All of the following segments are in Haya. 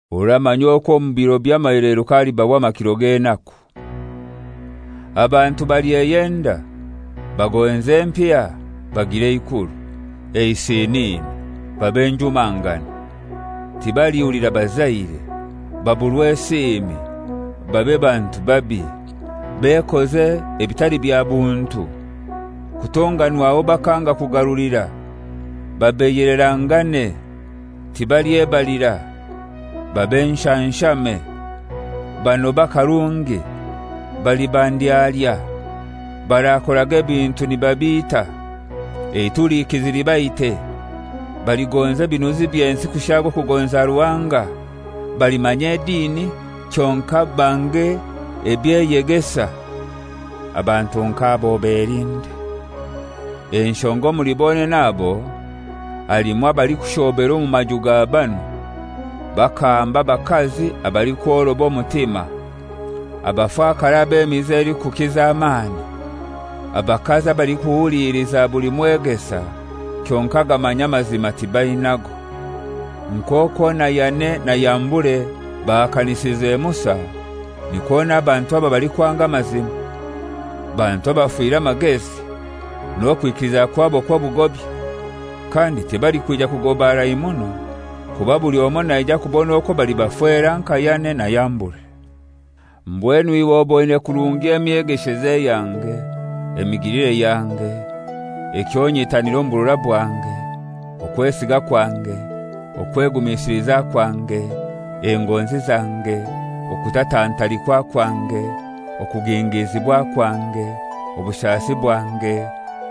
Oramanya okwo omu biro by'amaheleruka halibaho amakiro g'enaku. Abantu balyeyenda, bagonze empiya, bagire eikuru, eisinini, babe njumangani, tibalihulira bazaire, baburwe esiimi, babe bantu babi, bekoze ebitali bya buntu, kutonganwaho bakanga kugarulira, babeiyelerangane, tibalyebalira, babe nshanshame, banobe akarungi, baliba ndyalya, barakoraga ebintu nibabiita, eitulikizi libaite, baligonza ebinuzi by'ensi kushaaga okugonza Ruhanga, balimanya edini kyonkai bange eby'eyegesa. Abantu nk'abo obelinde. Enshonga omuli bonene abo halimu abalikushoobera omu maju ga banu, bakahamba abakazi abalikworoba omutima, abafakare ab'emize elikukiza amaani, abakazi abalikuhuliliza buli mwegesa, kyonkai agamanya amazima tibainago. Nk'okwo na Yane na Yambure bahakanisize Musa, nikwo n'abantu aba balikwanga amazima; bantu abafire amagezi, n'okwikiliza kwabo kw'obugobya. Kandi tibalikwija kugoba harai muno, kuba buli omoi naija kubona okwo bali bafera nka Yane na Yambure. Mbwenu iwe oboine kurungi emyegesheze yange, emigilire yange, ekyo nyitanira omu burora bwange, okwesiga kwange, okwegumisiliza kwange, engonzi zange, okutatantalikwa kwange, okugingizibwa kwange, obushasi bwange,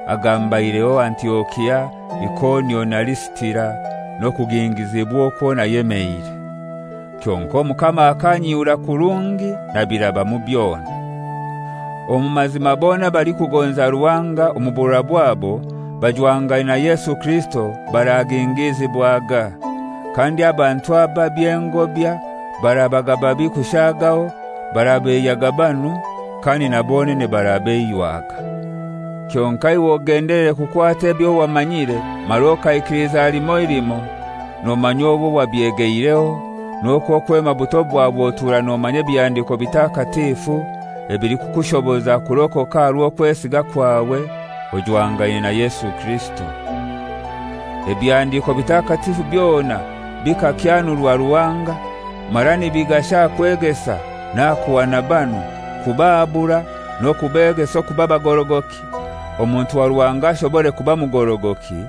agambaireho Antiokia, Ikonio na Lisitira, n'okugingizibwa okwo nayemeire. Kyonkai Omukama akanyihura kurungi nabirabamu byona. Omu mazima bona abalikugonza Ruhanga omu burora bwabo bajwangaine na Yesu Kirisito baragingizibwaga, kandi abantu ababi, engobya, barabaga babi kushaagaho, barabeiyaga banu, kandi na bonene barabeiywaga. Kyonkai iwe ogendelere kukwata ebyo wamanyire mara okaikiliza limoi limoi, nomanya owo wabyegeireho, n'okwo kwema buto bwawe otura nomanya Ebihandiko Bitakatifu ebilikukushoboza kurokoka aha rw'okwesiga kwawe ojwangaine na Yesu Kirisito. Ebihandiiko Bitakatifu byona bikakyanurwa Ruhanga, mara nibigasha aha kwegesa, n'aha kuhana banu, kubahabura, n'okubegesa okuba bagorogoki, omuntu wa Ruhanga ashobore kuba mugorogoki,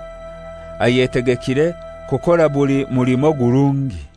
ayetegekire kukora buli mulimo ogurungi.